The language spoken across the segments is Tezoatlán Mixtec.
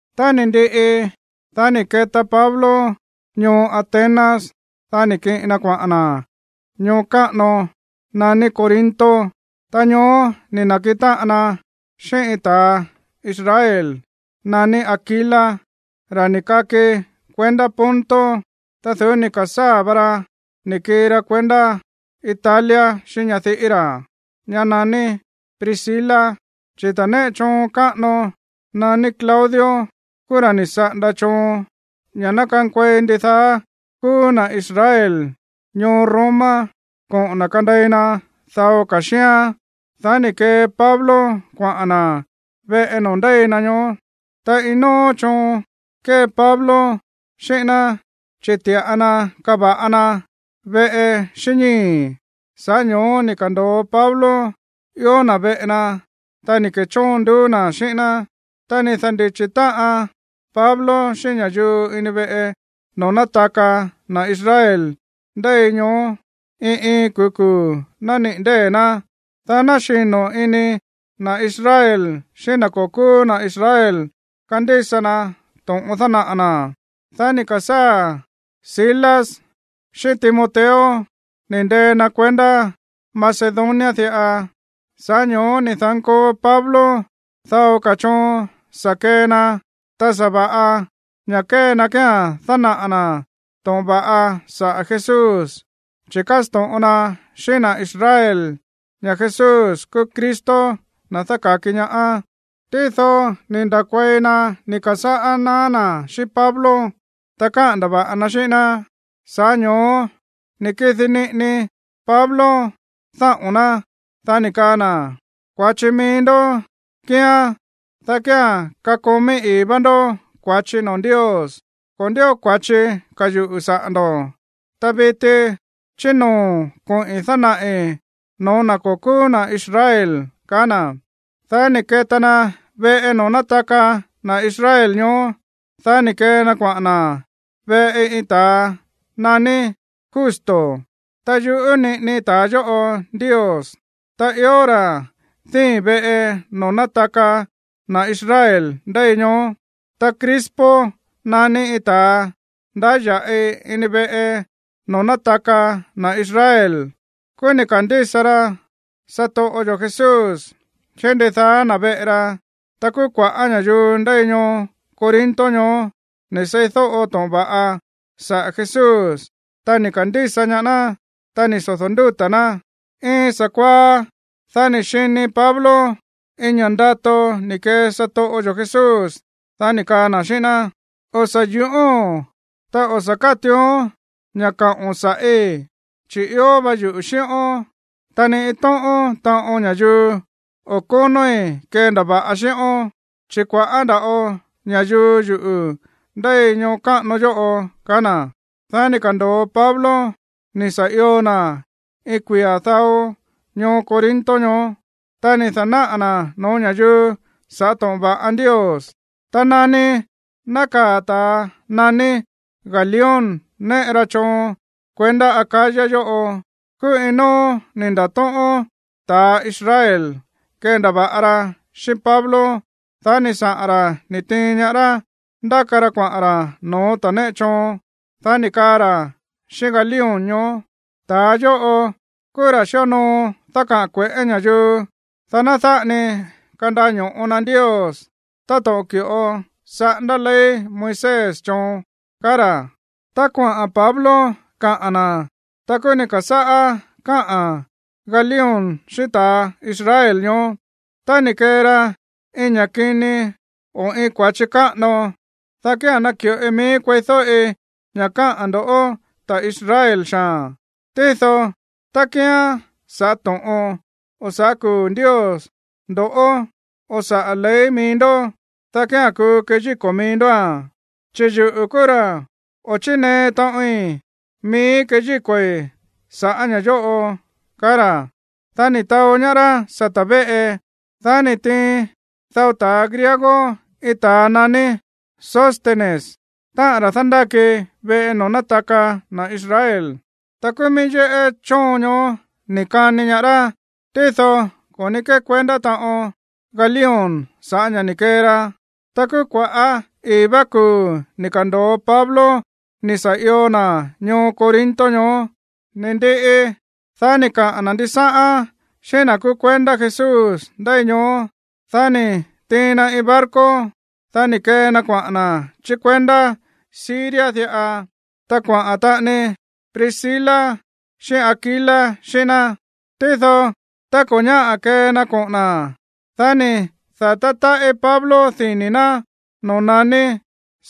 Tá ni̱ ndiꞌi, dá ni̱ keta Pablo ñoo Atenas. Dá ni̱ kiꞌin na kuaꞌa̱n na̱ ñoo káꞌano naní Corinto. Tá ñoó ni̱ na̱kiꞌin táꞌan na xíꞌín iin ta̱ Israel naní Aquila, ra̱ ni̱ kaki kuendá Ponto. Ta du̱ú ni̱ ka̱sáa̱ va ra ni̱ kii ra kuendá Italia xíꞌín ñadiꞌí ra̱, ñá naní Priscila, chi̱ ta̱a néꞌe choon káꞌano naní Claudio kúú ra̱ ni̱ saꞌanda choon ña̱ ná kankuei ndidaá kúú na̱ Israel ñoo Roma koꞌo̱n na̱ kandei na dao ka̱ xíán. Dá ni̱ kee Pablo kuaꞌa̱n na̱ veꞌe noo̱ ndéi na ñoó. Ta iin nóó choon kée Pablo xíꞌín ná, chi̱ ti̱ꞌa na kava̱ꞌa na veꞌe xíꞌín ñíi̱. Sa̱ꞌá ño̱ó ni̱ ka̱ndo̱o Pablo ió na̱ veꞌe na, ta ni̱ ke̱chóon nduú na̱ xíꞌín ná. Ta ni̱ da̱ndíchi̱ táꞌan Pablo xíꞌín ña̱yuu ini veꞌe noo̱ nátaka na̱ Israel ndéi ñoó iin iin kuu̱ kuu̱ nániꞌi̱ ndée̱ ná, dá ná xino̱ ini na̱ Israel xíꞌín na̱ ko̱ kúú na̱ Israel kandísa na to̱ꞌon dánaꞌa̱ na̱. Dá ni̱ ka̱sáa̱ Silas xíꞌín Timoteo ni̱ ndee na kuendá Macedonia diꞌa. Sa̱ꞌá ño̱ó ni̱ da̱nkoo Pablo dao ka̱ choon sa̱ kee na, ta sa̱va̱ꞌa ña̱ kée na kía̱n dánaꞌa̱ na̱ to̱ꞌon va̱ꞌa saꞌa̱ Jesús, chi̱ kásto̱ꞌon na xíꞌín na̱ Israel ña̱ Jesús kúú Cristo, na̱ dáka̱ki ñaá. Tído ni̱ nda̱kuei na ni̱ ka̱sáꞌá naá na̱ xíꞌín Pablo, ta káꞌa̱n ndava̱ꞌa na xíꞌín ná. Sa̱ꞌá ño̱ó ni̱ kidi niꞌini Pablo dáꞌo̱n ná, dá ni̱ kaa na̱: ―Kua̱chi mií ndó kíán, dá kía̱n kakomí ii̱ vá ndó kua̱chi noo̱ Ndios. Ko̱ ndío kua̱chi ka̱ yuꞌu̱ saꞌa̱ ndo̱. Ta viti chí noo̱ koꞌi̱n dánaꞌi̱ no̱ó na̱ ko̱ kúú na̱ Israel ―kaá na̱. Dá ni̱ keta na veꞌe noo̱ nátaka na̱ Israel ñoó. Dá ni̱ kee na kuaꞌa̱n na̱ veꞌe iin ta̱a naní Justo, ta yuꞌú niꞌini ta̱a yóꞌo Ndios. Ta ió ra̱ díi̱n veꞌe noo̱ nátaka na̱ Israel ndéi ñoó. Ta Crispo naní iin ta̱a ndáya̱ꞌi ini veꞌe noo̱ nátaka na̱ Israel, kúú ni̱ ka̱ndísa ra satoꞌo yo̱ Jesús xíꞌín ndidaá na̱ veꞌe ra. Ta kúú kua̱ꞌá ña̱yuu ndéi ñoo Corinto ñoó ni̱ seídóꞌo to̱ꞌon va̱ꞌa saꞌa̱ Jesús, ta ni̱ ka̱ndísa ñaá ná, ta ni̱ sodo̱ ndúta̱ ná. Iin sa̱kuaá, dá ni̱ xini Pablo iin ña̱ꞌa ndato ni̱ kee satoꞌo yo̱ Jesús, dá ni̱ kaa na̱ xíꞌín ná: ―O̱ sa̱ yu̱ꞌóo̱n. Ta o̱ sa̱ kátuuón ña̱ kaꞌo̱n sa̱ꞌí. Chi̱ ió va yuꞌu̱ xíꞌón, ta ni iin tóꞌón taꞌon ña̱yuu o̱ kónóí kendava̱ꞌa xíꞌón. Chi̱ kua̱ꞌá nda̱ꞌo ña̱yuu yuꞌu̱ ndéi ñoo káꞌano yóꞌo ―kaá na̱. Dá ni̱ ka̱ndo̱o Pablo ni̱ sa̱ io na̱ iin kuia̱ dao ñoo Corinto ñoó. Ta ni̱ da̱náꞌa̱ na̱ no̱ó ña̱yuu sa̱ꞌá to̱ꞌon va̱ꞌa Ndios. Ta nani nákaa̱ ta̱a naní Galión néꞌe ra choon kuendá Acaya yóꞌo, kúú iin nóó ni̱ nda̱tóꞌón ta̱a Israel kendava̱ꞌa ra xíꞌín Pablo. Dá ni̱ saꞌa̱n ra̱ ni̱ tiin ñaá rá ndáka ra kuaꞌa̱n ra̱ no̱ó ta̱ néꞌe choon. Dá ni̱ kaa ra̱ xíꞌín Galión ñoó: ―Ta̱a yóꞌo kúú ra̱ xíonoo dákaꞌa̱n kue̱ꞌé ña̱yuu, dá ná dáꞌa ni kandaño̱ꞌo na Ndios táto̱ꞌon ki̱ꞌo saꞌándá ley Moisés choon ―kaá ra̱. Tá kuaꞌa̱n Pablo kaꞌa̱n na̱, ta kúú ni̱ ka̱sáꞌá káꞌa̱n Galión xíꞌín ta̱a Israel ñoó: ―Tá ni̱ kee ra iin ña̱ kini o iin kua̱chi káꞌano, dá kía̱n naki̱ꞌoi miíí kueídóꞌi ña̱ káꞌa̱n ndoꞌó, ta̱ Israel xaa̱n. Tído tá kíán sa̱ꞌá to̱ꞌon, o sa̱ꞌá kuu̱ Ndios ndo̱ o saꞌa̱ ley mií ndoꞌó, dá kía̱n kuu keyíko̱ mií ndóa̱n, chi̱ yuꞌu̱ kúú ra̱ o̱ chínee taꞌoin miíí keyíko̱i̱ sa̱ꞌá ña̱ yóꞌo ―kaá ra̱. Dá ni̱ taó ñaá rá sata̱ véꞌe. Dá ni̱ tiin dao ta̱ griego iin ta̱a naní Sóstenes, táꞌa̱n ra̱ dándáki veꞌe noo̱ nátaka na̱ Israel. Ta kúú mií yéꞌé chóon ñoó ni̱ kani ñaá rá. Tído ko̱ ní kékuendá taꞌon Galión sa̱ꞌá ña̱ ni̱ kee ra. Ta kúú kuaꞌa̱ ii̱ vá kuu̱ ni̱ ka̱ndo̱o Pablo ni̱ sa̱ io na̱ ñoo Corinto ñoó. Ni̱ ndiꞌi, dá ni̱ kaꞌa̱n na̱ ndisáꞌán xíꞌín na̱ kúú kuendá Jesús ndéi ñoó. Dá ni̱ tiin na iin barco. Dá ni̱ kee na kuaꞌa̱n na̱ chí kuendá Siria diꞌa. Ta kuaꞌa̱n taꞌani Priscila xíꞌín Aquila xíꞌín ná. Tído tá ko̱ ñáꞌa̱ kee na koꞌo̱n na̱, dá ni̱ da̱tá táꞌí Pablo dini̱ ná noo̱ naní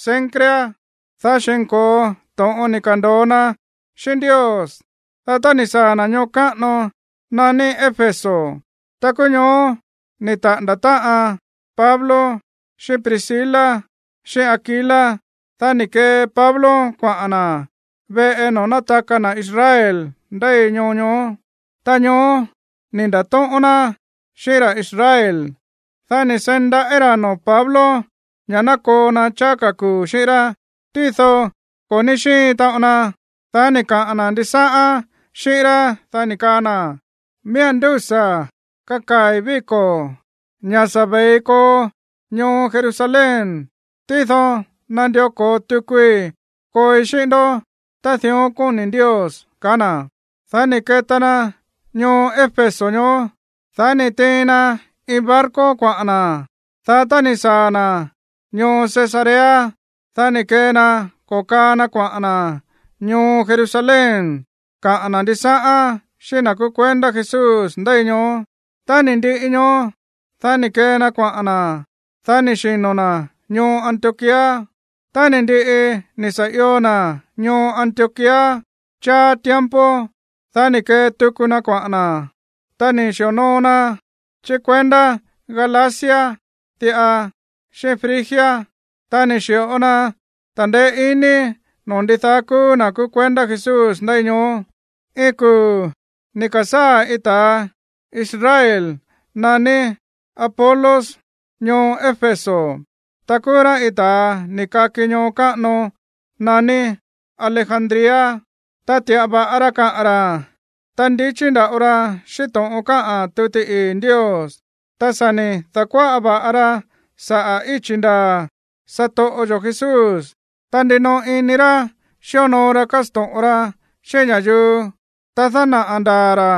Cencrea, dá xi̱nko̱o to̱ꞌon ni̱ ka̱ndo̱o na xíꞌín Ndios. Dá tá ni̱ saa̱ na̱ ñoo káꞌano naní Éfeso, ta kúú ñoó ni̱ taꞌa̱nda̱ táꞌan Pablo xíꞌín Priscila xíꞌín Aquila. Dá ni̱ kee Pablo kuaꞌa̱n na̱ veꞌe noo̱ nátaka na̱ Israel ndéi ñoo ñoó. Ta ñoó ni̱ nda̱tóꞌón ná xíꞌín ra̱ Israel. Dá ni̱ seí ndaꞌí ra̱ noo̱ Pablo ña̱ ná koo na cháá ka̱ kuu̱ xíꞌín rá, tído ko̱ ní xíin taꞌon na. Dá ni̱ kaꞌa̱n na̱ ndisáꞌán xíꞌín rá, dá ni̱ kaa na̱: ―Miía̱n ndúsa̱ kakaa̱i̱ víko̱ ña̱ sa̱ ve̱i koo ñoo Jerusalén, tído nandió ko̱o tukui kooi xíꞌín ndó tá dión kóni̱ Ndios ―kaá na̱. Dá ni̱ keta na ñoo Éfeso ñoó, dá ni̱ tiin na iin barco kuaꞌa̱n na̱. Dá tá ni̱ saa̱ na̱ ñoo Cesarea, dá ni̱ kee na ko̱kaa na kuaꞌa̱n na̱ ñoo Jerusalén kaꞌa̱n na̱ ndisáꞌán xíꞌín na̱ kúú kuendá Jesús ndéi ñoó. Tá ni̱ ndiꞌi ñoó, dá ni̱ kee na kuaꞌa̱n na̱, dá ni̱ xino̱ na̱ ñoo Antioquía. Tá ni̱ ndiꞌi ni̱ sa̱ io na̱ ñoo Antioquía cháá tiempo, dá ni̱ kee tuku na kuaꞌa̱n na̱, ta ni̱ xi̱onoo na chí kuendá Galacia diꞌa, xíꞌín Frigia, ta ni̱ xi̱ꞌo na ta̱ndeé iní noo̱ ndidaá kúú na̱ kúú kuendá Jesús ndéi ñoó. Iin kuu̱ ni̱ ka̱sáa̱ iin ta̱ Israel naní Apolos ñoo Éfeso. Ta kúú rá iin ta̱a ni̱ kaki ñoo káꞌano naní Alejandría. Ta ti̱ꞌa va̱ꞌa ra kaꞌa̱n ra̱, ta ndichí nda̱ꞌo ra xíꞌín to̱ꞌon káꞌa̱n tuti ii̱ Ndios. Ta sa̱ ni̱ da̱kuáꞌa va̱ꞌa ra saꞌa̱ íchi̱ ndaa̱ satoꞌo yo̱ Jesús. Ta ndinoꞌo ini ra̱ xíonoo ra kásto̱ꞌon ra xíꞌín ña̱yuu, ta dánaꞌa̱ ndaa̱ ra̱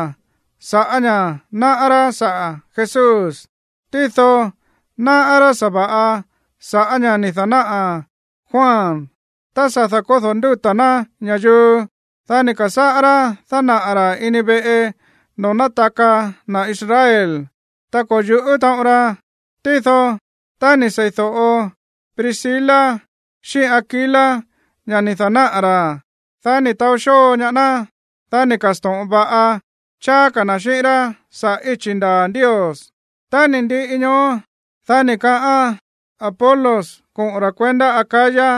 sa̱ꞌá ña̱ náꞌá rá saꞌa̱ Jesús. Tído náꞌá rá sa̱va̱ꞌa sa̱ꞌá ña̱ ni̱ da̱náꞌa̱ Juan tá sa̱ da̱kódo̱ ndúta̱ ná ña̱yuu. Dá ni̱ ka̱sáꞌá rá dánaꞌa̱ ra̱ ini veꞌe noo̱ nátaka na̱ Israel, ta ko̱ yu̱ꞌú taꞌon ra. Tído tá ni̱ sei̱do̱ꞌo Priscila xíꞌín Aquila ña̱ ni̱ da̱náꞌa̱ ra̱, dá ni̱ taó xóo ñaá ná. Dá ni̱ ka̱sto̱ꞌon va̱ꞌa cháá ka̱ na̱ xíꞌín rá saꞌa̱ íchi̱ ndaa̱ Ndios. Tá ni̱ ndiꞌi ñoó, dá ni̱ kaꞌán Apolos koꞌo̱n ra̱ kuendá Acaya.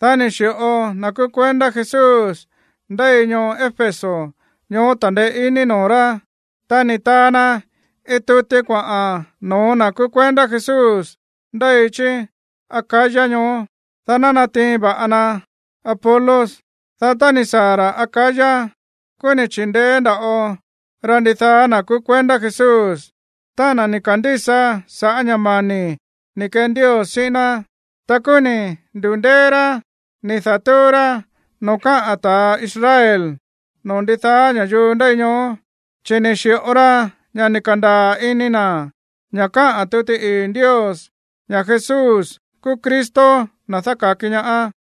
Dá ni̱ xi̱ꞌo na̱ kúú kuendá Jesús ndéi ñoo Éfeso ñoó ta̱ndeé iní noo̱ rá. Ta ni̱ taa na iin tuti kuaꞌa̱n no̱ó na̱ kúú kuendá Jesús ndéi chí Acaya ñoó, dá ná natiin va̱ꞌa na Apolos. Dá tá ni̱ saa̱ ra̱ Acaya, kúú ni̱ chi̱ndeé nda̱ꞌo ra ndidaá na̱ kúú kuendá Jesús, táꞌa̱n na̱ ni̱ ka̱ndísa sa̱ꞌá ña̱ mani̱ ni̱ kee Ndios xíꞌín ná. Ta kúú ni̱ ndu̱ndéé rá ni̱ da̱túú rá noo̱ káꞌa̱n ta̱ Israel noo̱ ndidaá ña̱yuu ndéi ñoó, chi̱ ni̱ xi̱ꞌo ra ña̱ ni̱ ka̱ndaa̱ ini na̱ ña̱ káꞌa̱n tuti ii̱ Ndios, ña̱ Jesús kúú Cristo, na̱ dáka̱ki ñaá.